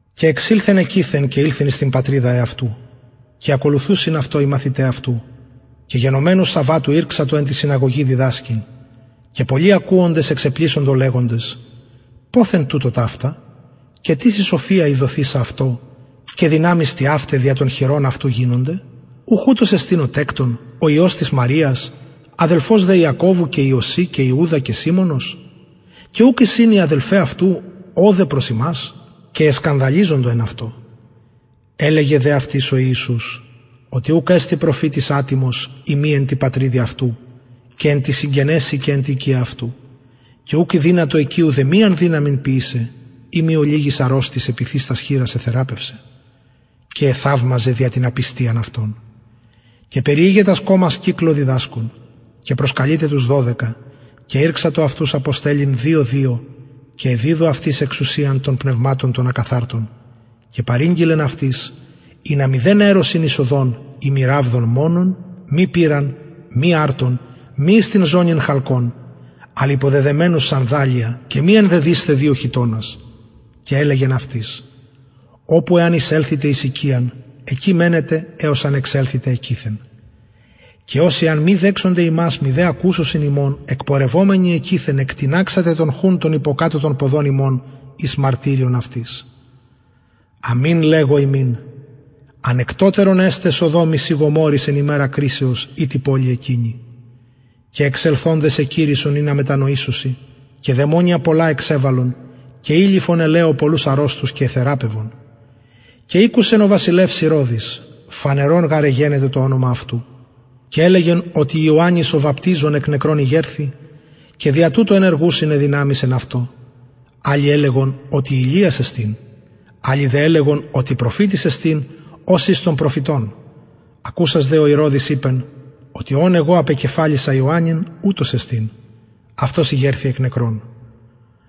και εξηλθεν εκειθεν και ηλθεν εις την πατριδα αυτου και ακολουθουσιν αυτω οι μαθηται αυτου και γενομενου σαββατου ηρξατο εν τη συναγωγη διδασκειν και πολλοι ακουοντες εξεπλησσοντο λεγοντες ποθεν τουτω ταυτα και τις η σοφια η δοθεισα αυτω και δυναμεις τοιαυται δια των χειρων αυτου γινονται ουχ ουτος εστιν ο τεκτων ο υιος μαριας αδελφος δε ιακωβου και ιωση και ιουδα και σιμωνος και ουκ εισιν αι αδελφαι αυτου ωδε προς ημας και εσκανδαλιζοντο εν αυτω ελεγεν δε αυτοις ο ιησους οτι ουκ εστιν προφητης ατιμος ει μη εν τη πατριδι αυτου και εν τοις συγγενεσιν και εν τη οικια αυτου και ουκ ηδυνατο εκει ουδεμιαν δυναμιν ποιησαι ει μη ολιγοις αρρωστοις επιθεις τας χειρας εθεραπευσεν και εθαυμαζεν δια την απιστιαν αυτων και περιηγεν τας κωμας κυκλω διδασκων και προσκαλειται τους δωδεκα και ηρξατο αυτους αποστελλειν δυο δυο και εδιδου αυτοις εξουσιαν των πνευματων των ακαθαρτων και παρηγγειλεν αυτοις ινα μηδεν αιρωσιν εις οδον ει μη ραβδον μονον μη πηραν μη αρτον μη εις την ζωνην χαλκον αλλ υποδεδεμενους σανδαλια και μη ενδυσησθε δυο χιτωνας και ελεγεν αυτοις οπου εαν εισελθητε εις οικιαν εκει μενετε εως αν εξελθητε εκειθεν και οσοι αν μη δεξωνται υμας μηδε ακουσωσιν υμων εκπορευομενοι εκειθεν εκτιναξατε τον χουν τον υποκατω των ποδων υμων εις μαρτυριον αυτοις αμην λεγω υμιν ανεκτοτερον εσται σοδομοις η γομορροις εν ημερα κρισεως η τη πολει εκεινη και εξελθοντες εκηρυσσον ινα μετανοησωσιν και δαιμονια πολλα εξεβαλλον και ηλειφον ελαιω πολλους αρρωστους και εθεραπευον και ηκουσεν ο βασιλευς ηρωδης φανερον γαρ εγενετο το ονομα αυτου και ελεγεν οτι ιωαννης ο βαπτιζων εκ νεκρων ηγερθη και δια τουτο ενεργουσιν αι δυναμεις εν αυτω αλλοι ελεγον οτι ηλιας εστιν αλλοι δε ελεγον οτι προφητης εστιν ως εις των προφητων ακουσας δε ηρωδης ειπεν οτι ον εγω απεκεφαλισα ιωαννην ουτος εστιν αυτος ηγερθη εκ νεκρων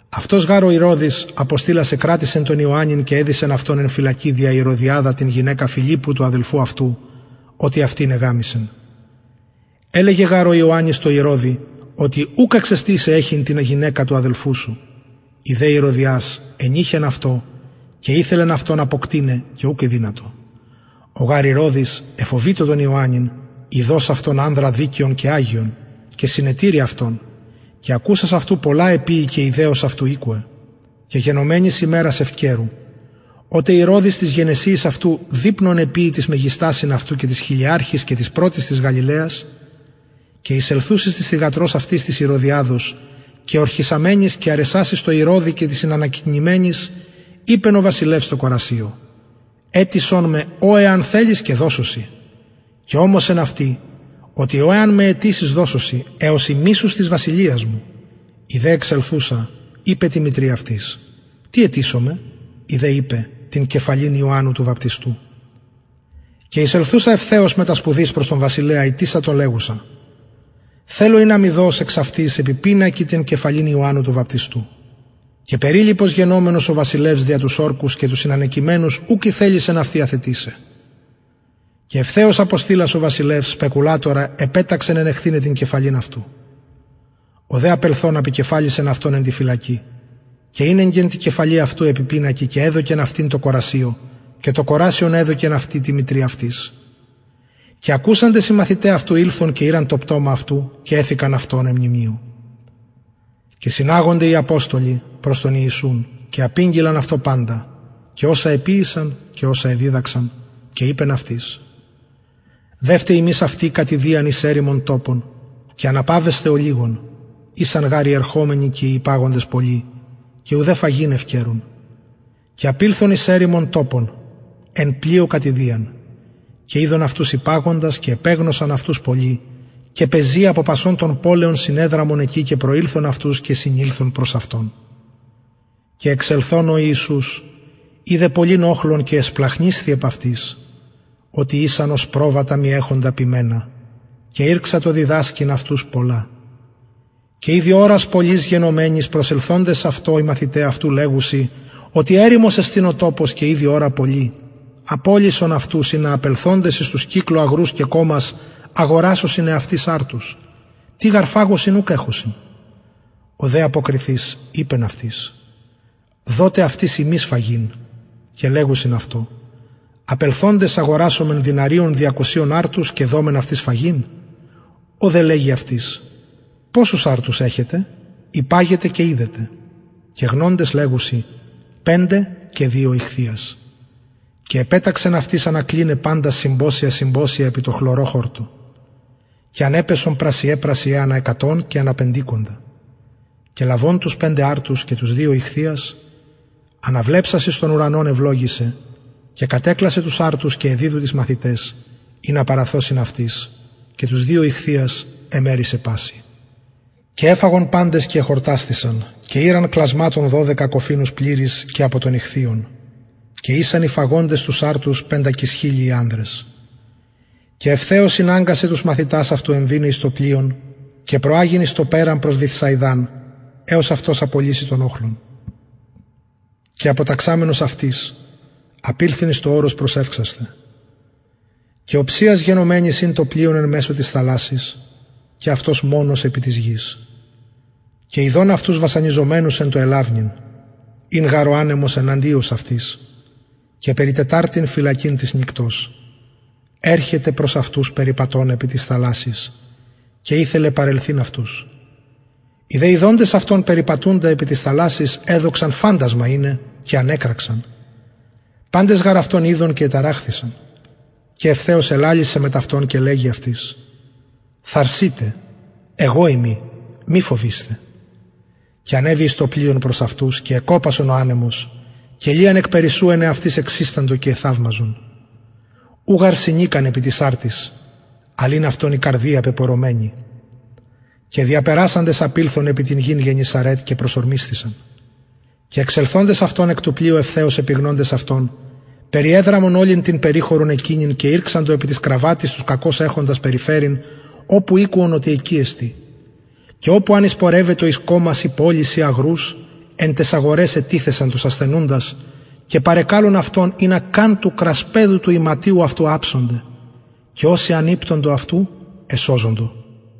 αυτος γαρ ο ηρωδης αποστειλας εκρατησεν τον ιωαννην και εδησεν αυτον εν φυλακη δια ηρωδιαδα την γυναικα φιλιππου του αδελφου αυτου οτι αυτην εγαμησεν ελεγεν γαρ ο ιωαννης τω ηρωδη οτι ουκ εξεστιν σοι εχειν την γυναικα του αδελφου σου η δε ηρωδιας ενειχεν αυτω και ηθελεν αυτον αποκτειναι και ουκ ηδυνατο ο γαρ ηρωδης εφοβειτο τον ιωαννην ειδως αυτον ανδρα δικαιον και αγιον και συνετηρει αυτον και ακουσας αυτου πολλα εποιει και ηδεως αυτου ηκουεν και γενομενης ημερας ευκαιρου οτε ηρωδης τοις γενεσιοις αυτου δειπνον εποιει τοις μεγιστασιν αυτου και τοις χιλιαρχοις και τοις πρωτοις της γαλιλαιας και εισελθουσης της θυγατρος αυτης της ηρωδιαδος και ορχησαμενης και αρεσασης τω ηρωδη και τοις συνανακειμενοις ειπεν ο βασιλευς τω κορασιω αιτησον με ο εαν θελης και δωσω σοι και ωμοσεν αυτη οτι ο εαν με αιτησης δωσω σοι εως ημισους της βασιλειας μου η δε εξελθουσα ειπεν τη μητρι αυτης τι αιτησομαι η δε ειπεν την κεφαλην ιωαννου του βαπτιστου και εισελθουσα ευθεως μετα σπουδης προς τον βασιλεα ητησατο λεγουσα θελω ινα μοι δως εξαυτης επι πινακι την κεφαλην ιωαννου του βαπτιστου και περιλυπος γενομενος ο βασιλευς δια τους ορκους και τους συνανακειμενους ουκ ηθελησεν αυτην αθετησαι και ευθεως αποστειλας ο βασιλευς σπεκουλατορα επεταξεν ενεχθηναι την κεφαλην αυτου ο δε απελθων απεκεφαλισεν αυτον εν τη φυλακη και ηνεγκεν την κεφαλην αυτου επι πινακι και εδωκεν αυτην τω κορασιω και το κορασιον εδωκεν αυτην τη μητρι αυτης και ακουσαντες οι μαθηται αυτου ηλθον και ηραν το πτωμα αυτου και εθηκαν αυτο εν μνημειω και συναγονται οι αποστολοι προς τον ιησουν και απηγγειλαν αυτω παντα και οσα εποιησαν και οσα εδιδαξαν και ειπεν αυτοις δευτε υμεις αυτοι κατ ιδιαν εις ερημον τοπον και αναπαυεσθε ολιγον ησαν γαρ οι ερχομενοι και οι υπαγοντες πολλοι και ουδε φαγειν ευκαιρουν και απηλθον εις ερημον τοπον τω πλοιω κατ ιδιαν και ειδον αυτους υπαγοντας και επεγνωσαν αυτον πολλοι και πεζη απο πασων των πολεων συνεδραμον εκει και προηλθον αυτους και συνηλθον προς αυτον και εξελθων ειδεν ο ιησους πολυν οχλον και εσπλαγχνισθη επ αυτοις οτι ησαν ως προβατα μη εχοντα ποιμενα και ηρξατο διδασκειν αυτους πολλα και ηδη ωρας πολλης γενομενης προσελθοντες αυτω οι μαθηται αυτου λεγουσιν οτι ερημος εστιν ο τοπος και ηδη ωρα πολλη απολυσον αυτους ινα απελθοντες εις τους κυκλω αγρους και κωμας αγορασωσιν εαυτοις αρτους τι γαρ φαγωσιν ουκ εχουσιν ο δε αποκριθεις ειπεν αυτοις δοτε αυτοις υμεις φαγειν και λεγουσιν αυτω απελθοντες αγορασωμεν δηναριων διακοσιων αρτους και δωμεν αυτοις φαγειν ο δε λεγει αυτοις ποσους αρτους εχετε υπαγετε και ιδετε και γνοντες λεγουσιν πεντε και δυο ιχθυας και επεταξεν αυτοις ανακλιναι παντας συμποσια συμποσια επι τω χλωρω χορτω και ανεπεσον πρασιαι πρασιαι ανα εκατον και ανα πεντηκοντα και λαβων τους πεντε αρτους και τους δυο ιχθυας αναβλεψας εις τον ουρανον ευλογησεν και κατεκλασεν τους αρτους και εδιδου τοις μαθηταις αυτου ινα παραθωσιν αυτοις και τους δυο ιχθυας εμερισεν πασιν και εφαγον παντες και εχορτασθησαν και ηραν κλασματων δωδεκα κοφινους πληρεις και απο των ιχθυων και ησαν οι φαγοντες τους αρτους πεντακισχιλιοι ανδρες και ευθεως ηναγκασεν τους μαθητας αυτου εμβηναι εις το πλοιον και προαγειν εις το περαν προς βηθσαιδαν εως αυτος απολυση τον οχλον και αποταξαμενος αυτοις απηλθεν εις το ορος προσευξασθαι και οψιας γενομενης ην το πλοιον εν μεσω της θαλασσης και αυτος μονος επι της γης και ειδεν αυτους βασανιζομενους εν τω ελαυνειν ην γαρ ο ανεμος εναντιος αυτοις και περι τεταρτην φυλακην της νυκτος ερχεται προς αυτους περιπατων επι της θαλασσης και ηθελεν παρελθειν αυτους οι δε ιδοντες αυτον περιπατουντα επι της θαλασσης εδοξαν φαντασμα ειναι και ανεκραξαν παντες γαρ αυτον ειδον και εταραχθησαν και ευθεως ελαλησεν μετ αυτων και λεγει αυτοις θαρσειτε εγω ειμι μη φοβεισθε και ανεβη προς αυτους εις το πλοιον και εκοπασεν ο ανεμος και λιαν εκπερισσου εν εαυτοις εξισταντο και εθαυμαζον ου γαρ συνηκαν επι τοις αρτοις ην γαρ αυτων η καρδια πεπωρωμενη και διαπερασαντες ηλθον επι την γην γεννησαρετ και προσωρμισθησαν και εξελθοντων αυτων εκ του πλοιου ευθεως επιγνοντες αυτον περιδραμοντες ολην την περιχωρον εκεινην ηρξαντο επι τοις κραββατοις τους κακως εχοντας περιφερειν οπου ηκουον οτι εκει εστιν και οπου αν εισεπορευετο εις κωμας η πολεις η αγρους εν ταις αγοραις ετιθουν τους ασθενουντας και παρεκαλουν αυτον ινα καν του κρασπεδου του ιματιου αυτου αψωνται και οσοι αν ηπτοντο αυτου εσωζοντο